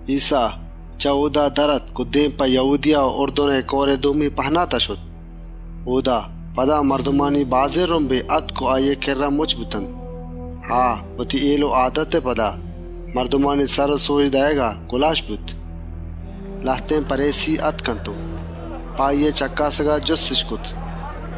‏ ایسّا، چه اۆدا در آتک و دێم په یَهودیَهئے دَمگ و اُرْدُنئے کئورئے دومی پهناتا شت. اۆدا، پدا مردمانی بازێن رُمبے آتک و آییئے کِرّا مُچّ بوت. آ، وتی هێل و آدتئے سرا، مردمانی سر و سۆج دئیگا گُلاێش بوت. ‏ لهتێن پَریسی آتک و په آییئے چَکّاسگا جُستِش کرت: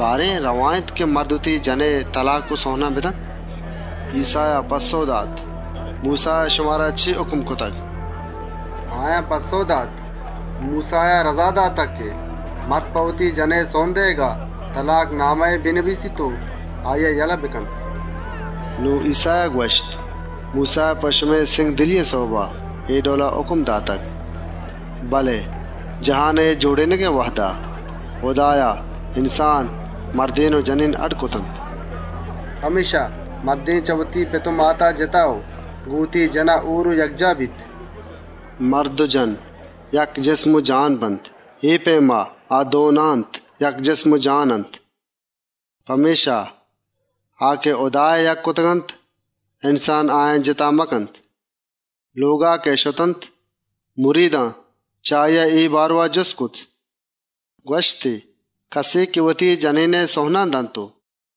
«بارێن، رئوا اِنت که مرد وتی جَنئے تلاک و سئونان بدنت؟» ‏ ایسّایا پَسّئو دات: «موسّایا شمارا چے هُکم کرتگ؟» ‏ آیان پَسّئو دات: «موسّایا رَزا داتگ که مرد په وتی جَنئے سئون دئیگا، تلاک‌نامَهے بنبیسیت و آییا بگیشّێنیت.» ‏ نون ایسّایا گوَشت: «موسّایا په شمئے سِنگدلیئے سئوبا اے ڈئولا هُکم داتگ. ‏ بله جهانئے جۆڑێنگئے وهدا، هُدایا انسان مردێن و جنێن اڈّ کرتگ. ‏ پمێشکا، مرد چه وتی پت و ماتا جِتا و گۆن وتی جَنا هۆر و یکجاهَ بیت. ‏ مرد و جَن، یک جسم و جانَ بنت، اے پئیما، نون آ دو نه‌اَنت، یک جسم و جان اَنت. ‏ پمێشکا، آ که هُدایا یکّ کرتگ‌اَنت، انسان آیان جِتا مکنت.» ‏ لۆگا که شتنت، مریدان چه آییا اے بارئوا جُست کرت. ‏ گوَشتی: «کَسے که وتی جنێنئے سئون و تلاکانَ دنت و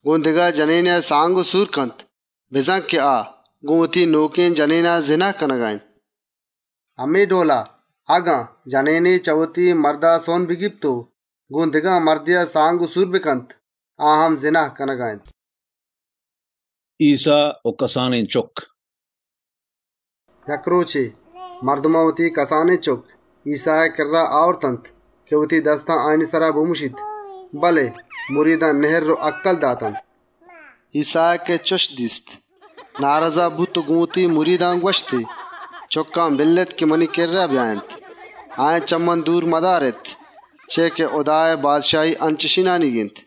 گۆن دگه جنێنێا سور و سانگَ کنت بزان که آ، گۆن وتی نۆکێن جنا زِنا کنگا اِنت. ‏ همے ڈئولا، اگن جنێنے چه وتی مردا سئون بگیپت و گۆن دگه مردێا سانگ و سور بکنت، آ هم زِنا کنگا اِنت.» ایسّا و کسانێن چُکّ ‏ یک رۆچے، مردمان وتی کسانێن چُکّ، ایسّائے کِرّا آورتنت که وتی دستا آیانی سرا بمُشیت، بله مریدان نِهرّ و هَکَّل داتنت. ‏ ایسّایا که چُش دیست نارزا بوت و گۆن مریدان گوَشتی: «چُکّان بِلّێت منی کِرّا بیاینت، آیانی دێما مدارێت، چیا که هُدائے بادشاهی انچێن مردمانیگ اِنت. ‏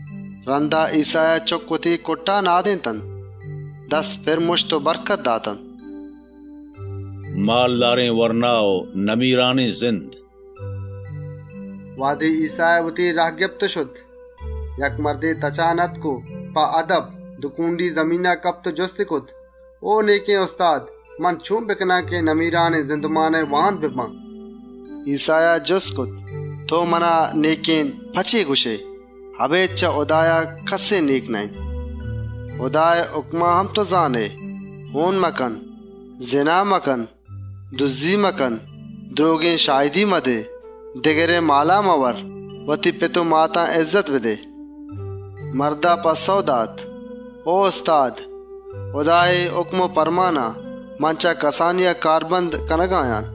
رَندا ایسّایا چُکّ وتی کُٹّا نندارێنتنت، دستی پِر مُشت و برکتی داتنت. زَردارێن وَرنا و نمیرانێن زِند ‏ وهدے ایسّایا وتی راه گپت و شت، یک مردے تچانا آتک، کۆنڈان کپت و جُستی کرت: «او نێکێن استاد! من چۆن بکنان که نمیرانێن زِندئے واهند ببان؟» ‏ ایسّایا گوَشت: «تئو منا ‹نێکێن› په چے گوَشئے؟ اَبێد چه هُدایا، کَسّ نێک نه‌اِنت. ‏ هُدائے هُکمان هم تئو زانئے: هۆن مکن، زِنا مکن، دُزّی مکن، درۆگێن شاهدی مدئے، دگرئے مالا مئوَر، وتی پت و ماتا اِزّت بدئے.» ‏ مردا پَسّئو دات: «او استاد! هُدائے اے هُکم و پرمانان، من چه کسانیا کاربند کنگا آن.» ‏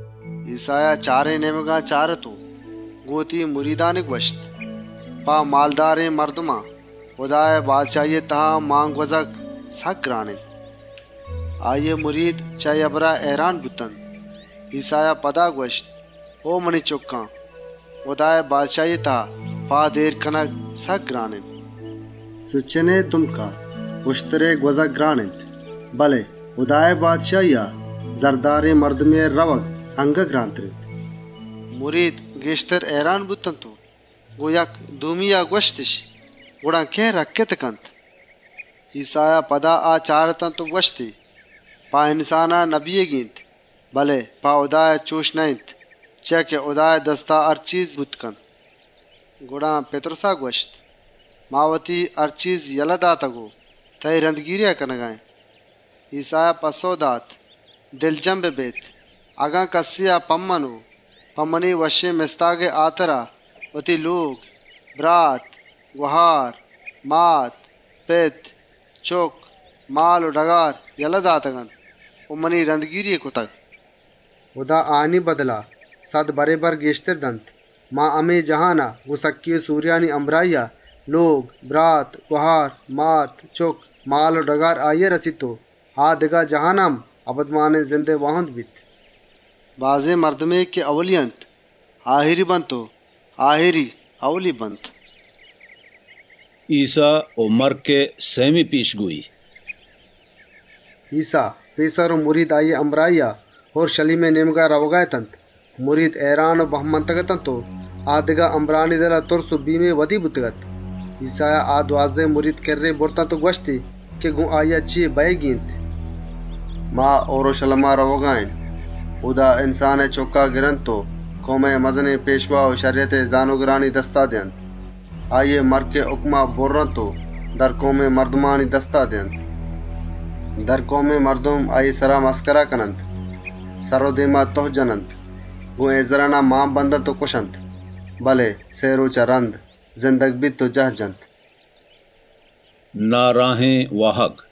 ایسّایا چارێن نێمگان چارت و گۆن وتی مریدان گوَشتی: «په مالدارێن مردمان، هُدائے بادشاهیا پاد اێر کنگ سکّ گران اِنت.» ‏ آییئے مرید چه اے هبران هئیران بوتنت. ایسّایا پدا گوَشت: «او منی چُکّان! هُدائے بادشاهیا پاد اێر کنگ، سکّ گران اِنت. ‏ چه سوچنئے دُمکا اُشترئے گوَزگ وه باز گران اِنت، بله هُدائے بادشاهیا، زردارێن مردمئے رئوگ اَنگت گرانتر اِنت.» ‏ مرید، گێشتر هئیران بوتنت و گۆن یکدومیا گوَشتِش: «گڑا کئے رَکّتَ کنت؟» ‏ ایسّایا پدا آ چارتنت و گوَشتی: «په انسانا نبوتنی اِنت، بله په هُدایا چُش نه‌اِنت، چیا که هُدائے دستا هر چیز بوتَ کنت.» ‏ گڑا پِتْرُس گوَشگا لگّت: «ما وتی هر چیز یله داتگ و تئیی رَندگیریا کنگا اێن.» ‏ ایسّایا پَسّئو دات: «باور کنێت، اگن کَسێا په من و په منی وشّێن مستاگا وتی لۆگ، برات و گهار، مات و پت، چُکّ یا مال و ڈگار یله داتگ‌اَنت و منی رَندگیری‌ای کرتگ، ‏ هُدا آیانی بدلا سَد برابر گێشترَ دنت. همے جهانا، گۆن سکّی و سۆریانی همراهیا، لۆگ، برات و گهار، مات، چُکّ، مال و ڈگار آییا رسیت و آ دگه جهانا هم اَبدمانێن زِندئے واهندَ بیت. ‏ بله بازێنے که ائولی اِنت، آهِریَ بیت و هما که آهِری اِنت، ائولیَ بیت.» ایسّائے مَرکئے سئیمی پێشگۆیی ‏ ایسّا، پێسر و مرید آییئے همراهیا، اورْشَلیمئے نێمگا رئوگا اتنت. مرید، هئیران و بَه مانگ اتنت و آ دگه همراهانی دلا، تُرس و بیمّے ودی بوتگ‌اَت. ایسّایا آ دوازدهێن مرید کِرّێا برت و گوَشتنت که گۆن آییا چے بئیگی اِنت. ‏ «نون ما اورْشَلیما رئوگا اێن، اۆدا انسانئے چُکّا گرنت و مزنێن دینی پێشوا و شَریَتئے زانۆگرانی دستا دئینت. آییئے مَرکئے هُکما بُرّنت و درکئومێن مردمانی دستا دئینتی. ‏ درکئومێن مردم آییئے سرا ریشکند و مَسکرا کننت، سر و دێما تُهَ جننت، شلّاک و هئیزرانیَ جننت و کُشنتی، بله سئے رۆچا رَند، زندگَ بیت و جاهَ جنت.» ناراهێن واهگ ‏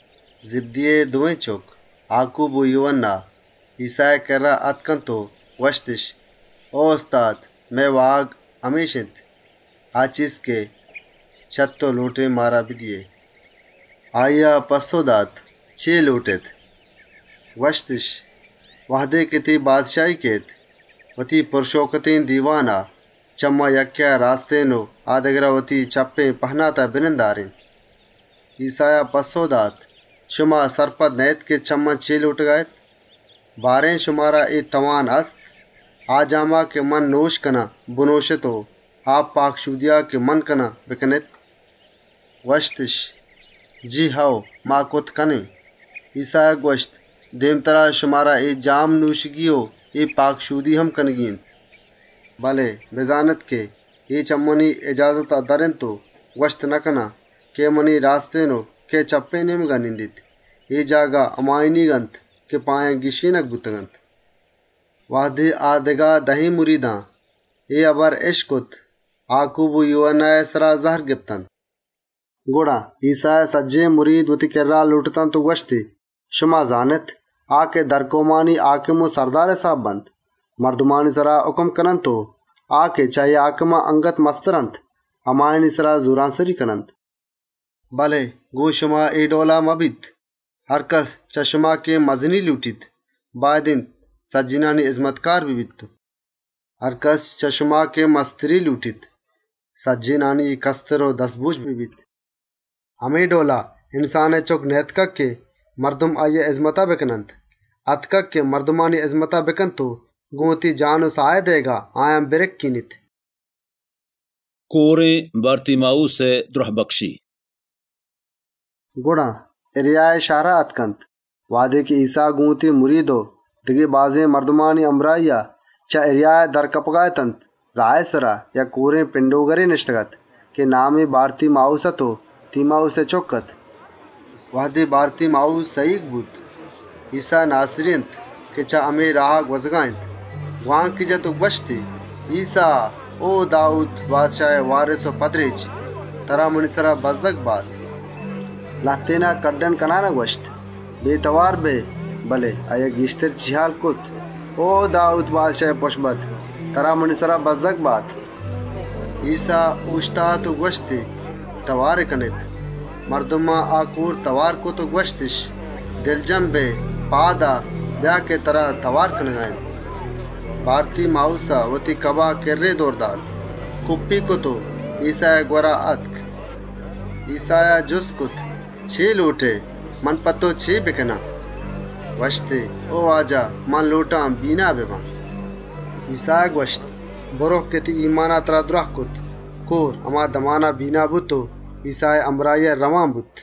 زِبْدیئے دوێن چُکّ آکوب و یوهَنّا، ایسّائے کِرّا آتکنت و گوَشتِش: «او استاد! مئے واهگ همِش اِنت، آ چیز که چه تئو لۆٹێن مارا بدئیئے.» ‏ آییا پَسّئو دات: «چے لۆٹێت؟» ‏ گوَشتِش: «وهدے تئیی بادشاهیَ کئیت، وتی پُرشئوکتێن دیوانا، چه ما یکّێا وتی راستێن و آ دگرا چپّێن نێمگا بنندارێن.» ‏ ایسّایا پَسّئو دات: «شما نزانێت چے لۆٹگا اێت. بارێن، شمارا اے توان هست، آ جاما که من نۆشَ کنان بنۆشێت و آ پاکشۆدیا که منَ کنان بکنێت؟» ‏ گوَشتِش: «جی هئو، اے کارا کرتَ کنێن.» ایسّایا گوَشت: «دێمترا، شمارا اے جام نۆشگی و اے پاکشۆدی هم کنگی اِنت، ‏ بله بزانێت که اے چه منی اِجازتا در اِنت و گوَشتَ نکنان کئے منی راستێن و کئے چپّێن نێمگا نندیت. اے جاگه، همایانیگ اَنت که په آیان گیشّێنگ بوتگ‌اَنت.» ‏ وهدے آ دگه دهێن مریدان اے هبر اِشکت، آکوب و یوهَنّائے سرا زَهر گپتنت. ‏ گڑا، ایسّایا سجّهێن مرید لۆٹتنت و گوَشتی: «شما زانێت که درکئومانی هاکم مردمانی سرا هاکمیَ کننت و کئومانی مستر چێردستانی سرا وتی اِهتیارا کارَ بندنت. ‏ بله شما چُش مکنێت، چه شما هرکَس که مزنیَ لۆٹیت، باید اِنت سجّهێنانی هِزمتکار ببیت و ‏ چه شما هرکَس که مستریَ لۆٹیت، سجّهێنانی کَستر و دَزبۆج ببیت. ‏ همے ڈئولا، انسانئے چُکّ نئیاتکگ که مردم آییئے هِزمتا بکننت، آتکگ که مردمانی هِزمتا بکنت و گۆن وتی ساهئے دئیگا، بازێنێا برَکّێنیت.» کۆرێن بارتیماووسئے دْرهبکشی ‏ گڑا، اَریهائے شهرا آتکنت. وهدے ایسّا گۆن وتی مرید و دگه بازێن مردمانی همراهیا، چه اَریهایا در کپگا اَت، راهئے سرا، یک کۆرێن پِنڈۆگرے نِشتگ‌اَت که نامی بارتیماووس اَت و تیماووسئے چُکّ اَت. ‏ وهدے بارتیماووس سَهیگ بوت، ایسّا ناسِری اِنت که چه همے راها گوَزگا اِنت، گوانکی جت و گوَشتی: «ایسّا، او داوود بادشاهئے چُکّ! ترا منی سرا بَزّگ بات.» ‏ لهتێنا هکّل کنانا گوَشت: «بێتئوار بئے!» بله آییا گێشتر کوکّار کرت: «او داوود بادشاهئے چُکّ! ترا منی سرا بَزّگ بات.» ‏ ایسّا اۆشتات و گوَشتی: «تئواری کنێت.» مردمان آ کۆر تئوار کرت و گوَشتِش: «دلا مزن کن! پاد آ، بیا که ترا تئوار کنگا اِنت.» ‏ بارتیماووسا وتی کباه کِرّے دئور دات، کُپّی کرت و ایسّائے گوَرا آتک. ‏ ایسّایا جُست کرت: «چے لۆٹئے؟ من په تئو چے بکنان؟» گوَشتی: «او استاد! منَ لۆٹان بینا ببان.» ‏ ایسّایا گوَشت: «برئو که تئیی ایمانا ترا دْراه کرت.» کۆر، هما دمانا بینا بوت و ایسّائے همراهیا رئوان بوت.